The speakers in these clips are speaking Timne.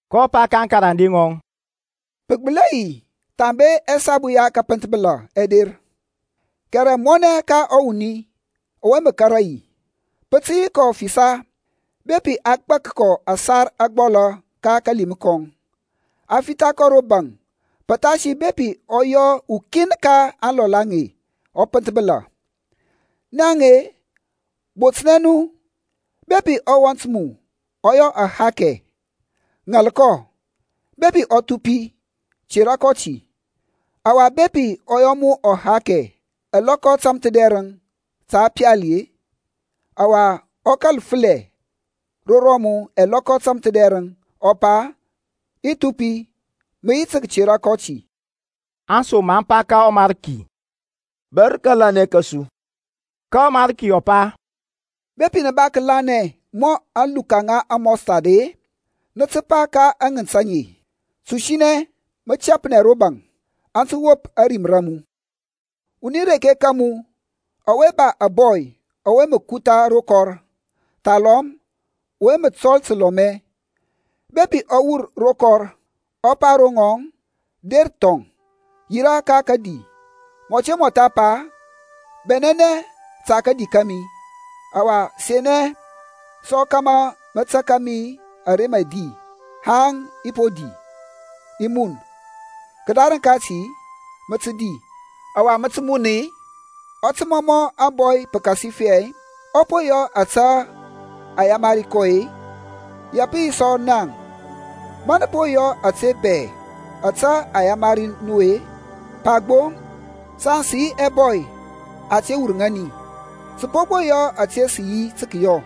kɔ pa ka aŋkarande ŋɔŋ, Pə gbəli hɛ yi thambe ɛsabu ya kəpənthbəla ɛ der, kɛrɛ mɔnɛ ka ɔwuni ɔwe mə kȧrȧ yi! Pə tə yi kɔ fisa bepi a gbak kɔ ȧsar ȧgbɔlȧ ka kalim kɔŋ, a fitha kɔ ro baŋ pəthasi bepi ɔ yɔ ukin ka aŋlɔl aŋe ɔ pənthbəla. Naŋ-e, botnɛ nu; bepi ɔwɔnt a mu ɔ yɔ ahakɛ, ŋal kɔ; bepi ɔ thupi, tera kɔ ti. Ɔwa bepi ɔ yɔ mu ahakɛ ɛlɔkɔ tȧmthədɛrəŋ ta pali-e, ɔwa ɔ kȧl fəlɛ ro rɔmu ɛlɔkɔ tȧmthədɛrəŋ, ɔ pa, I thupi, mə yi tə kətera kɔ ti. Aŋsom aŋ pa ka ɔMarki, Bȧr kȧlanɛ kȧsu. Ka ɔMarki ɔ pa, Bepi nə ba kəlanɛ mɔ aluka ŋa amustard-e, nə tə pa ka aŋənt aŋe, Tusinɛ, mə tɛpnɛ ro baŋ, aŋ tə wop ȧrim ra mu. Wuni reke ka mu ɔwe ba ȧbɔy ɔwe mə kutha ro kɔr, thalɔm ɔwe mə tɔl təlɔmɛ, bepi ɔ wur ro kɔr, ɔ pa ro ŋɔŋ, Der thɔŋ, yirȧ ka kədi, mɔ te mɔtha pa, Bɛnɛnɛ ta kadi kȧmi, ɔwa senɛ sɔ kȧmȧ mə taka mi ara mə i di haŋ i po di, i mun. Kədarəŋ kati, mə tə di, ɔwa mə tə mun-i? Ɔ tə mɔmɔ ȧŋbɔy pəkasifɛ ɔ po yɔ ȧte a yamari kɔ-i? Ya pə yi sɔ naŋ, ma nə po yɔ ȧtȧy bɛ ȧte a yamari nu-e, pa gbo, Saŋ sə yi ɛbɔy ɛte wur ŋani, sə po gbo yɔ ȧte sə yi tə kəyɔ.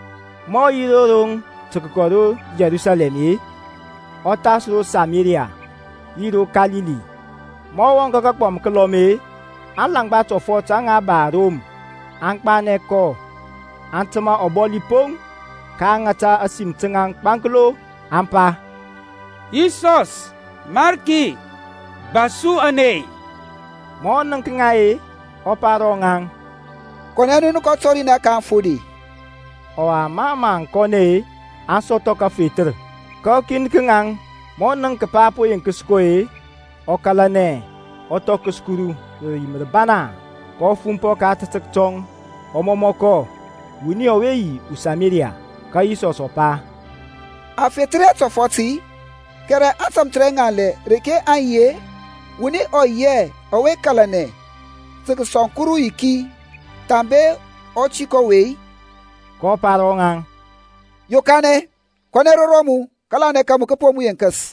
Ma ɔ yi ro roŋ tə kəkɔ ro Yerusalɛm-e, ɔ thas ro Samaria yi ro Kalili. Ma ɔ wɔŋ ka kagbɔm kəlɔm-e, alaŋgba tɔfɔt aŋa ba arom aŋ gbanɛ kɔ, aŋ təmȧ ɔbɔli poŋ. kaŋ ŋata ȧsim taŋ gbanklo, aŋ pa, Yisɔs, Mariki, ba su ȧney. Ma ɔ nənk ŋa-e, ɔ pa ro ŋaŋ, Kɔnɛ nu nə kɔ tɔrinɛ ka aŋfode. Ɔwa mɔ mə aŋ kɔnɛ-e, aŋ sɔthɔ kəfethər. Ka ukin ka ŋaŋ ma ɔ nənk kəpa a po yenkəs kɔ-e, ɔ kȧlanɛ, ɔ thɔkəs Kuru rə rim rəbana, kɔ fumpɔ ka ȧtȧtək tɔŋ, ɔ mɔmɔ kɔ. Ɔwuni ɔwe ɔ yi uSamaria. Ka Yisɔsȧŋ ɔ pa, A fethər hɛ aŋtɔfɔt-i? Kɛrɛ aŋtamthərɛŋanlɛ reke aŋ yi-e? Wuni ɔ yi hɛ ɔwe kȧlanɛ tə kəsɔŋ Kuru yiki thambe ɔtik ɔwe-i? kɔ pa ro ŋɔŋ, Yokanɛ, kɔnɛ ro rɔmu. Kȧlanɛ ka mu kə po mu yenkəs.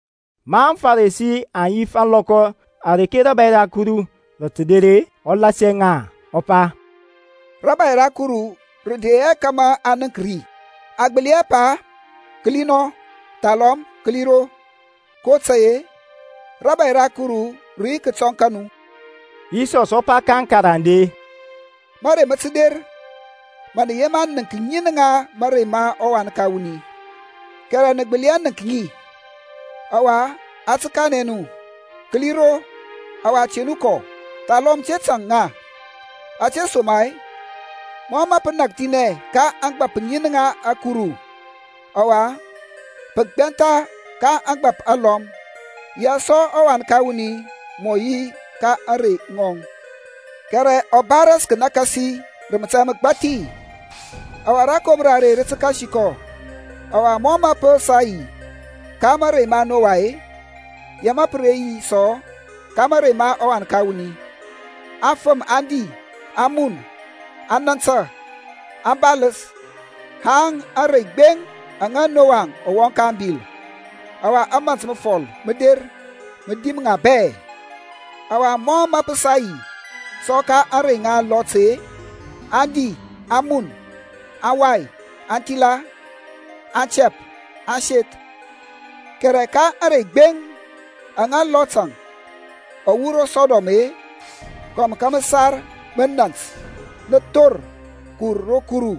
Ma aŋFarisi aŋ yif ȧŋlɔkɔ areke rȧbȧy ra Kuru rə tə der-e, ɔ lasia ŋa ɔ pa, Rȧbȧy ra Kuru rə de hɛ kȧmȧ a nənk ri. Aŋ gbəli hɛ pa, Kəli nɔ! Thalɔm, Kəli ro! kotȧy-e rȧbȧy ra Kuru rə yi kətɔŋ ka nu. Yisɔs ɔ pa ka aŋkarande, Mȧrey mə tə der ma nə yema nənk ŋin ŋa mȧrey ma ɔWan ka wuni, kɛrɛ nə gbəli hɛ nənk ŋi. Ɔwa a tə kanɛ nu, kəli nɔ; kəli ro. Ɔwa te nu kɔ, thalɔm te tȧŋ ŋa, ȧtesoma-e mɔ mə pə nakthinɛ ka ȧŋgbȧp ŋin ka ȧkuru, ɔwa pə gbɛntha ka ȧŋgbȧp alɔm; yaŋ sɔ ɔWan ka wuni mɔ yi ka ȧŋrey ŋɔŋ. Kɛrɛ ɔ ba ras kənakasi rə mȧtȧy məgbathi, ɔwa rȧkomra are rə tə kasi kɔ. Ɔwa mɔ mə pə sa yi ka mȧrey ma Noa-e, ya mə pə re yi sɔ ka mȧrey ma ɔWan ka wuni. Aŋfəm aŋ di, aŋ mun, aŋ nȧntȧ, aŋ baləs haŋ ȧŋrey gbeŋ aŋa Noa ɔ wɔŋ ka ȧŋbil, ɔwa ȧmȧnt məfɔl mə der mə dim ŋa bɛ. Ɔwa mɔ mə pə sa yi sɔ ka mȧrey ma Lot-əŋ; aŋ di, aŋ mun, aŋ wai, aŋ thila, aŋ tɛp, aŋ seth. Kɛrɛ ka ȧŋrey gbeŋ aŋa Lot-əŋ ɔ wur ro Sɔdɔm-e, kɔm ka məsar mənȧnt nə thor kəwur ro Kuru,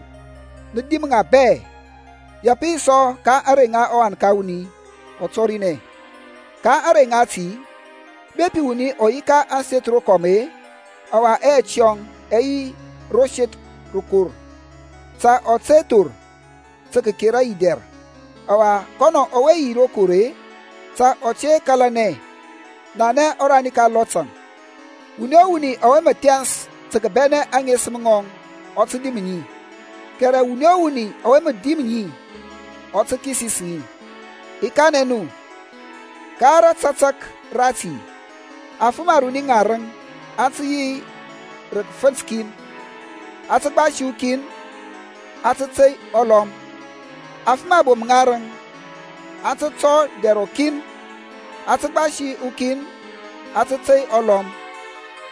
nə dim ŋa bɛ. Ya pə tə yi sɔ ka ȧŋrey aŋa ɔWan ka wuni ɔ tɔrinɛ. Ka ȧŋrey ŋati, bepi wuni ɔ yi ka ȧŋseth rokɔm-e, ɔwa ɛyɛt yɔŋ ɛ yi ro seth rokor, ta ɔ te thor tə kəkera yi dɛr; ɔwa kɔnɔ ɔwe yi ro kɔr-e, ta ɔ te kȧlanɛ. Nanɛ ɔrani ka Lot-əŋ. Wuni o wuni ɔwe mə thɛns tə kəbɛnɛ aŋesəm ŋɔŋ ɔ tə dim ŋi; kɛrɛ wuni o wuni ɔwe mə dim ŋi ɔ tə kisis ŋi. I kanɛ nu, ka ratatək rati afəm aruni ŋarəŋ aŋ tə yi rə kəfənt kin; a tə gbasi ukin, a tə tey ɔlɔm. Afəm abom ŋarəŋ aŋ tə tɔ dɛr rɔkin; a tə gbasi ukin, a tə tey ɔlɔm.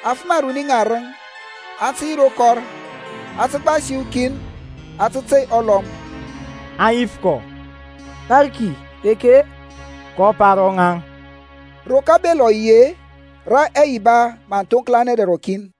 Afəm aruni ŋarəŋ aŋ tə yi ro kɔr; a tə gbasi ukin, a tə tey ɔlɔm. Aŋ yif kɔ, Mariki, reke-e? kɔ pa ro ŋaŋ, Ro kabel ɔ yi-e, rə ɛyiba mə aŋ thoŋklanɛ dɛr rɔkin.